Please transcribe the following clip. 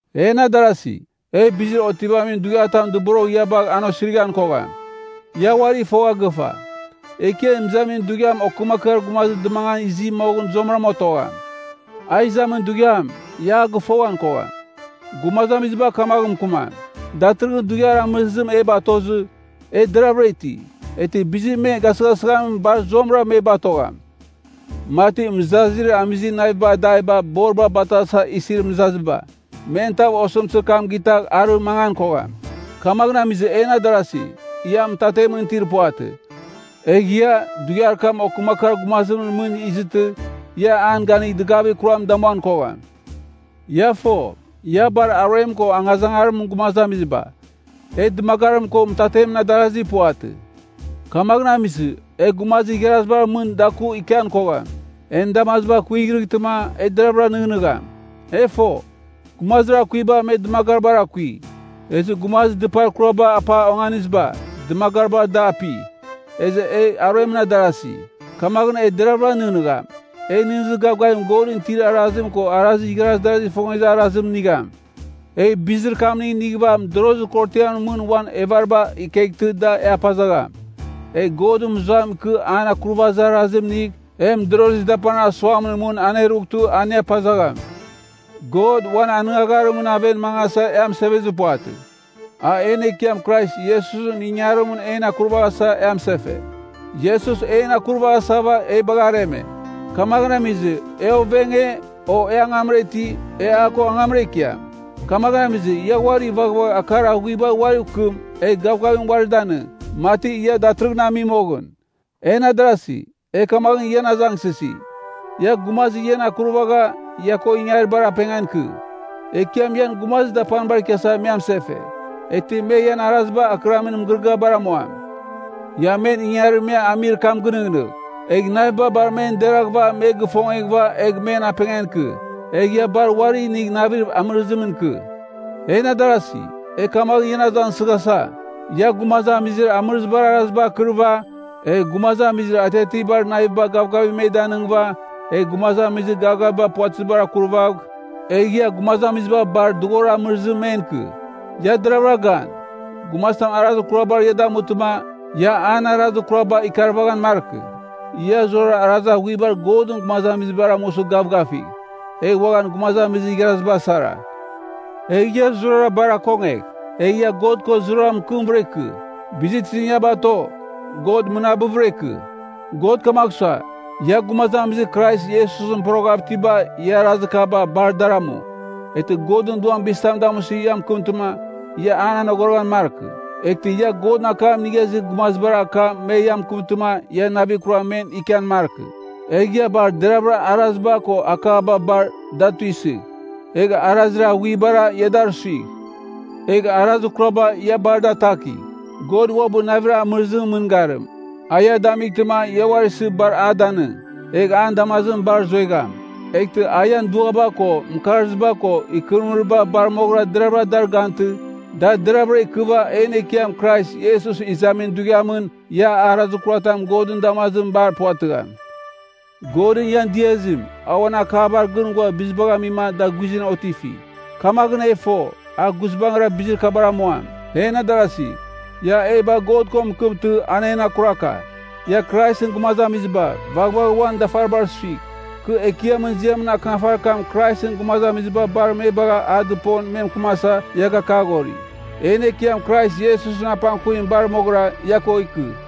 En adarasi, e bizir otivamin dughiatam dɨborogh ia bagh an osirighan kogham. Ia uari fogha gɨfa, Ekiam Izamin Dughiam okɨmakɨar gumazim dɨmangan izi moghɨn zuamɨrama otogham. A izamin dughiam, ia a gɨfoghan kogham. Gumazamiziba kamaghɨn mɨkɨmam, “Datɨrɨghɨn dughiar amɨrizim e batozɨ, e deravɨra iti.” Eghtɨ bizir me gasɨghasɨghamim bar zuamɨra me batogham, mati mɨzazir amizir naviba adaiba borim batasa isir mɨzaziba. Men tav osɨmtɨzir kam gitagh arɨ mangan kogham. Kamaghɨn amizɨ en adarasi, ia mɨtatemɨn itir puvatɨ, egh ia, dughiar kam okɨmakɨar gumazimɨn mɨn izɨtɨ, ia an ganigh dɨgavir kuram damuan kogham. Ia fo, ia bar aruem ko angazangarimɨn gumazamiziba. E dɨmagarim ko mɨtatemɨn adarasi puvatɨ. Kamaghɨn amizɨ, e gumazir igharazibar mɨn daku ikian kogham. En damaziba kuighreghtɨma e deraghvɨra nɨghnɨgham. E fo, gumazir akuiba me dɨmagaribar akui. Ezɨ gumazir dɨpar kuraba apa onganiziba, dɨmagaribar da api. Ezɨ e aruemɨn adarazi, kamaghɨn e deraghvɨra nɨghnɨgham. E nɨghnɨzir gavgavim Godɨn itir arazim ko igharaz darazigh ifongezir arazim nigham. Egh bizir kamning inighɨva mɨdorozir korotiamɨn mɨn uan evariba ikeghtɨ da e apazagham. Egh Godɨn mɨzuam ikɨ an akurvazir arazim inigh, e mɨdorozir dapanir asuamɨn mɨn anerughtɨ an e apazagham. God, uan anɨngagharimɨn aven mangasa e amɨsevezir puvatɨ. A en Ekiam Krais Iesusɨn ingangarimɨn en akurvaghasa e amɨsefe. Iesus en akurvaghasava e bagha areme. Kamaghɨn amizɨ, e ovenge, o e angamra iti, e a ko angamra ikiam. Kamaghɨn amizɨ, ia uari vaghvagh akar aghuibar uariv kɨm egh gavgavim uari danɨng, mati ia datɨrɨghɨn ami moghɨn. En adarasi, e kamaghɨn ian azangsɨsi, ia gumazir ian akurvagha ia ko ingaribar apengan ikɨ. Ekiam ian gumazir dapanibar ikiasa me amɨsefe, eghtɨ me ian araziba akɨramin mɨgɨrɨgɨabar amuam. Ia men ingangarir me amir kam gɨnɨghnɨgh, egh naviba bar men deraghɨva me gifongeghɨva egh men apengan ikɨ. Egh ia bar uari inigh navir amɨrɨzimɨn ikɨ. En adarasi, e kamaghɨn ian azangsɨghasa, ia gumazamizir amɨrɨzibar araziba akɨriva, egh gumazamizir atiatiabar naviba gavgavim me danɨngɨva, egh gumazamizir gavgaviba puvatɨziba akurvagh, egh ia gumazamiziba bar dughorir amɨrizim men ikɨ. Ia deravɨra gan, gumazitam arazir kurabar ia damutɨma, ia an arazir kuraba ikaravaghan markɨ. Ia zurara arazir aghuibar Godɨn gumazamizibar amusɨ gavgavigh, egh uaghan gumazamizir igharaziba sara. Egh ia zurara bar akongegh, egh ia God ko zurara mɨkɨmvɨra ikɨ. Bizir tizim ia bato, God mɨnabɨvɨra ikɨ. God kamagh sua, ia gumazamizir Krais Iesusɨn poroghav itiba ia arazir kaba bar, dar amu. Eghtɨ Godɨn Duam bizitam damusɨ ia mɨkɨmtɨma, ia an anogoroghan markɨ. Eghtɨ ia Godɨn akam inigha izir gumazibar akam me ia mɨkɨmtɨma ia navir kuram men ikian markɨ. Egh ia bar deravɨra araziba ko akaba bar, da tuisɨgh. Egh arazir aghuibara, ia dar suigh. Egh arazir kuraba ia bar da atakigh. God uabɨ navir amɨrɨzimɨn mɨngarim, a ia damightɨma ia uari isɨ bar a danɨng, egh an damazimɨn bar zuegham. Eghtɨ a ian duaba ko, mɨkarziba ko, ikɨrɨmɨriba bar moghɨra deraghvɨra dar gantɨ, da deraghvɨra ikɨva en Ekiam Krais Iesus izamin dughiamɨn ia arazir kuratam Godɨn damazimɨn bar puvatɨgham. Godɨn ian diazim, a uan akabar gɨn ghua bizibagh amima da guizɨn otifi. Kamaghɨn e fo, a guizbangɨra bizir kabar amuam. En adarasi, ia e bagh God ko mɨkɨmtɨ, a en akuraka. Ia Kraisɨn gumazamiziba, vaghvagh uan dafaribar suigh. Kɨ Ekiamɨn ziamɨn akɨnafarir kam Kraisɨn gumazamiziba bar me bagh a dɨpon me mɨkɨmasa ia gakaghori. En Ekiam Krais Iesusɨn apangkuvim bar moghɨra ia ko ikɨ.